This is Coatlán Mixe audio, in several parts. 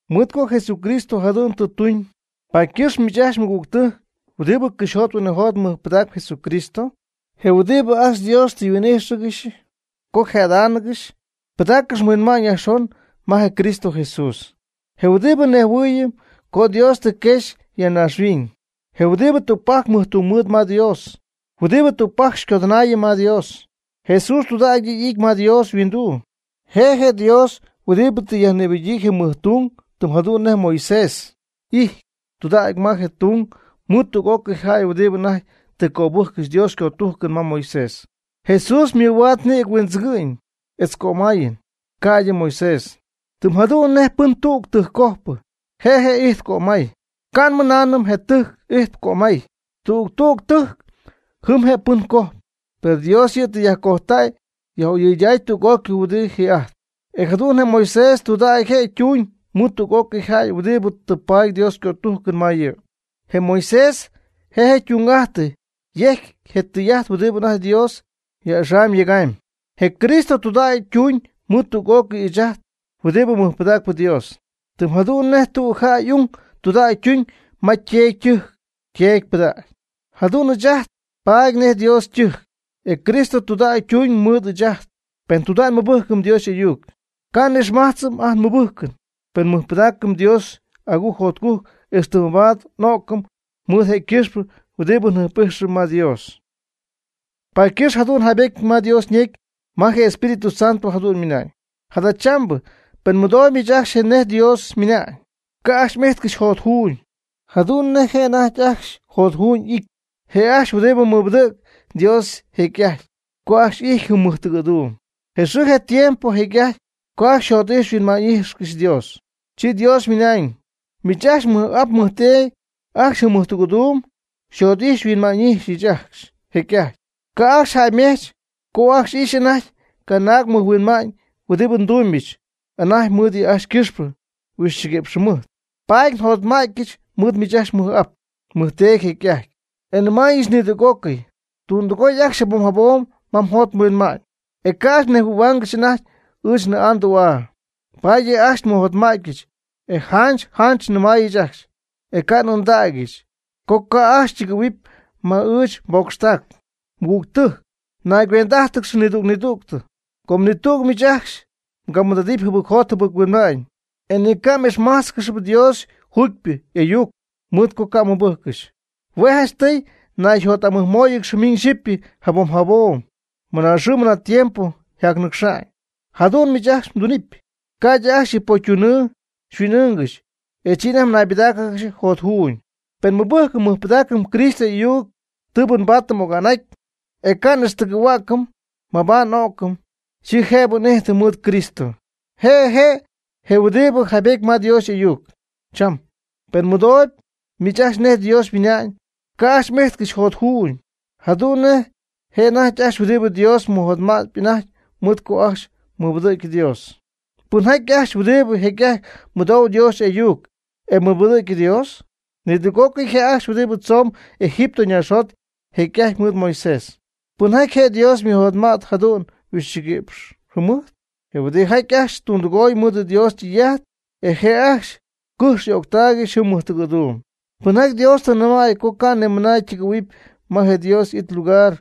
Mɨɨd co Jesucristo jadu'n tɨ tuñ, paady ycɨxp miich ajcxy mɨgügtɨjc huɨdibɨ cɨxyjot huinɨjot mɨjpɨdacp Jesucristo, je huɨdibɨ ajcxy Dios tɨ xyhuin'ijxcɨxy co xyje'adáanɨgɨxy. Pɨdaaccɨx mhuinma'ñ yajxon ma je Cristo Jesús, je huɨdibɨ nejhuɨɨyɨm co Dios tɨ quexy ya naaxhuiñ, je huɨdibɨ tügpajc mɨjtungmɨɨd ma Dios, huɨdibɨ tügpajc xycodɨnaayɨm ma Dios. Jesús tudägy yɨ' tɨ y'ity ma Dios yhuinduu, je Dios huɨdibɨ tɨ yajnïbɨgyii je mɨjtung, tɨm jadu'n nej Moisés y'ijty tudägy ma je ytung mɨɨd tüg'ócɨy jäy huɨdibɨ anajty tɨ cöbɨjccɨxy Dios ycötujcɨn ma Moisés. Jesús ymɨhuaad nïgɨ huindzɨgɨ'ñ etz cömayɨn, ca'ydɨ Moisés. Tɨm jadu'n nej pɨn tüg tɨjccojpɨ je' je' ijtp cömay, ca' nmɨnaanɨm je tɨjc ijtp cömay. Tüg tüg tɨjc jɨm je' pɨn cojp. Per Dios yɨ' tɨ yajcojtäy yaj'oyɨydäy tüg'ócɨy huɨdibɨ ji'ajtp. E jadu'n je Moisés tudägy je' ytuuñ mɨɨd tüg'ócɨy jäy huɨdibɨ tɨ paady Dios ycötujcɨn ma yɨ'. Je Moisés je' ytung'ajtɨ yejcy je tɨy'ajt huɨdibɨ anajty Dios jac'axam yegamyb. Je Cristo tudägy ytuñ mɨɨd tüg'ócɨy ɨɨch ajt huɨdibɨ mɨjpɨdacp Dios, tɨm jadu'n nej tüg jäy y'ung tudägy ytuñ ma yteedy ytɨjc yteedy ypɨdägy. Jadu'n ɨɨch ajt nbaady nej Dios ytɨjc, e Cristo tudägy ytuñ mɨɨd ɨɨch ajt, pen tudägy nmɨbɨjcɨm Dios y'ayuc, ca' n'ixmajtzɨm ajt nmɨbɨjcɨn. Pen nmɨjpɨdaacɨm Dios agujc jotcujc ixtɨ mabaad n'o'cɨm mɨɨd je' ycɨxpɨ huɨdibɨ njɨjp'ijxɨm ma Dios. Paady ycɨxp jadu'n yjaybetyɨty ma Dios ñecy ma je Espíritu Santo jadu'n ymɨnañ: Jadachambɨ pen mɨdooyb miich ajcxy nej Dios ymɨna'ñ, ca' ajcxy m'ijtcɨxy jotjuuñ jadu'n nej je' anajty ajcxy jotjuuñ y'ity, je' ajcxy huɨdibɨ mɨbɨdɨ̈gy Dios jecy'ajt (co ajcxy y'ijty jɨm mɨjtɨgɨ̈duum). Je xɨɨ je tiempo jecy'ajty co ajcxy jot'ijxy huinma'ñ'ijxy Dios. Chi Dios ymɨna'ñ: Miich ajcxy mmɨj'ap mmɨjteedy ajcxy jɨm mɨjtɨgɨ̈duum xyjot'ijx xyhuinma'ñy'ijxɨch ajcxy jecy'ajty. Ca' ajcxy jäymech co ajcxy y'ijxy anajty canaag mɨjhuinma'ñ huɨdibɨ ndumybɨch anajty mɨɨd yɨ' ajcxy ycɨxpɨ huixchiguïpx jɨmɨjt. Paady njotma'tyɨch mɨɨd miich ajcxy mmɨj'ap mmɨjteedy jecy'ajty, e nmɨnaañɨch: “Nɨɨdɨgoy tüdɨgoy ajcxy jabom jabom ma yjot yhuinma'ñ. E ca' ajcxy nejhuɨ̈huaangɨxy anajty ɨɨch nnɨɨ'aa ndü'aa.” Paady yɨ' ajcxy nmɨjotma'tyɨch, e janch janch nnɨmaayɨch ajcxy, e ca' n'ɨɨndägyɨch, co ca' ajcxy ytɨgɨ̈huɨpy ma ɨɨch nbocxtac. Mɨgügtɨjc, naygüend'ájtɨgɨx nidüg nidüg co ni tüg miich ajcxy mgamɨɨd'adɨp jɨbɨcjot jɨbɨc-huinma'ñ, e ni mga'ixmájtzcɨxɨpy Dios juugypɨ y'ayuc, mɨɨd co ca' mmɨbɨjccɨxy. Hue' janchtɨy nayjot'amɨjmóoyɨgɨxy miñ xyipy jabom jabom namɨ xɨɨ tiempo yjacnɨcxñɨ. Jadu'n miich ajcxy mdunɨpy, ca'ydɨ ajcxy yɨ pocytunɨɨ xyhuin'ɨɨngɨxy, e chi anajty mnaybɨdáacɨgɨxy jotjuuñ. Pen nmɨbɨjcɨm nmɨjpɨdaacɨm Cristo y'ayuc tɨɨbɨ nbaatɨm oga'n'aty, e ca' n'ixtɨgɨ̈hua'cɨm mabaad n'o'cɨm, chi jëbɨ n'ijtɨm mɨɨd Cristo. Je' je' je huɨdibɨ jaybetyɨty ma Dios y'ayuc: Cham, pen mmɨdooyb miich ajcxy nej Dios ymɨna'ñ, ca' ajcxy m'ijtcɨxy jotjuuñ, jadu'n nej je' anajty ajcxy huɨdibɨ Dios mɨjotma'tp anajty mɨɨd co ajcxy mɨbɨdɨ̈gy Dios. ¿Pɨnjaty ajcxy huɨdibɨ jecy'ajty mɨdou Dios y'ayuc e mɨbɨdɨ̈gy Dios? Nidüg'ócɨy je' ajcxy huɨdibɨ tzomb Egipto naaxjot jecy'ajty mɨɨd Moisés. ¿Pɨnjaty je Dios ymɨjotma't jadu'n huixchiguɨ̈px jɨmɨjt? Je huɨdijaty ajcxy tundɨgoy mɨɨd Dios ytɨy'ajt, e je' ajcxy cɨjx y'öctaaygɨxy jɨm mɨjtɨgɨ̈duum. ¿Pɨnjaty Dios ñɨmay co ni camɨna ytɨgɨ̈huɨpy ma je Dios y'it ylugar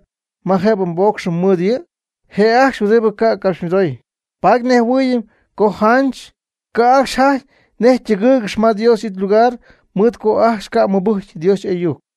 ma jëbɨ ypoocxcɨxy mɨɨd yɨ'? Je' ajcxy huɨdibɨ ca' ycapxymɨdoy. Paady nnejhuɨɨyɨm co janch ca' ajcxy jajty nej ytɨgɨ́ɨygɨxyɨpy ma Dios y'it ylugar mɨɨd co ajcxy ca' mɨbɨjcy Dios y'ayuc.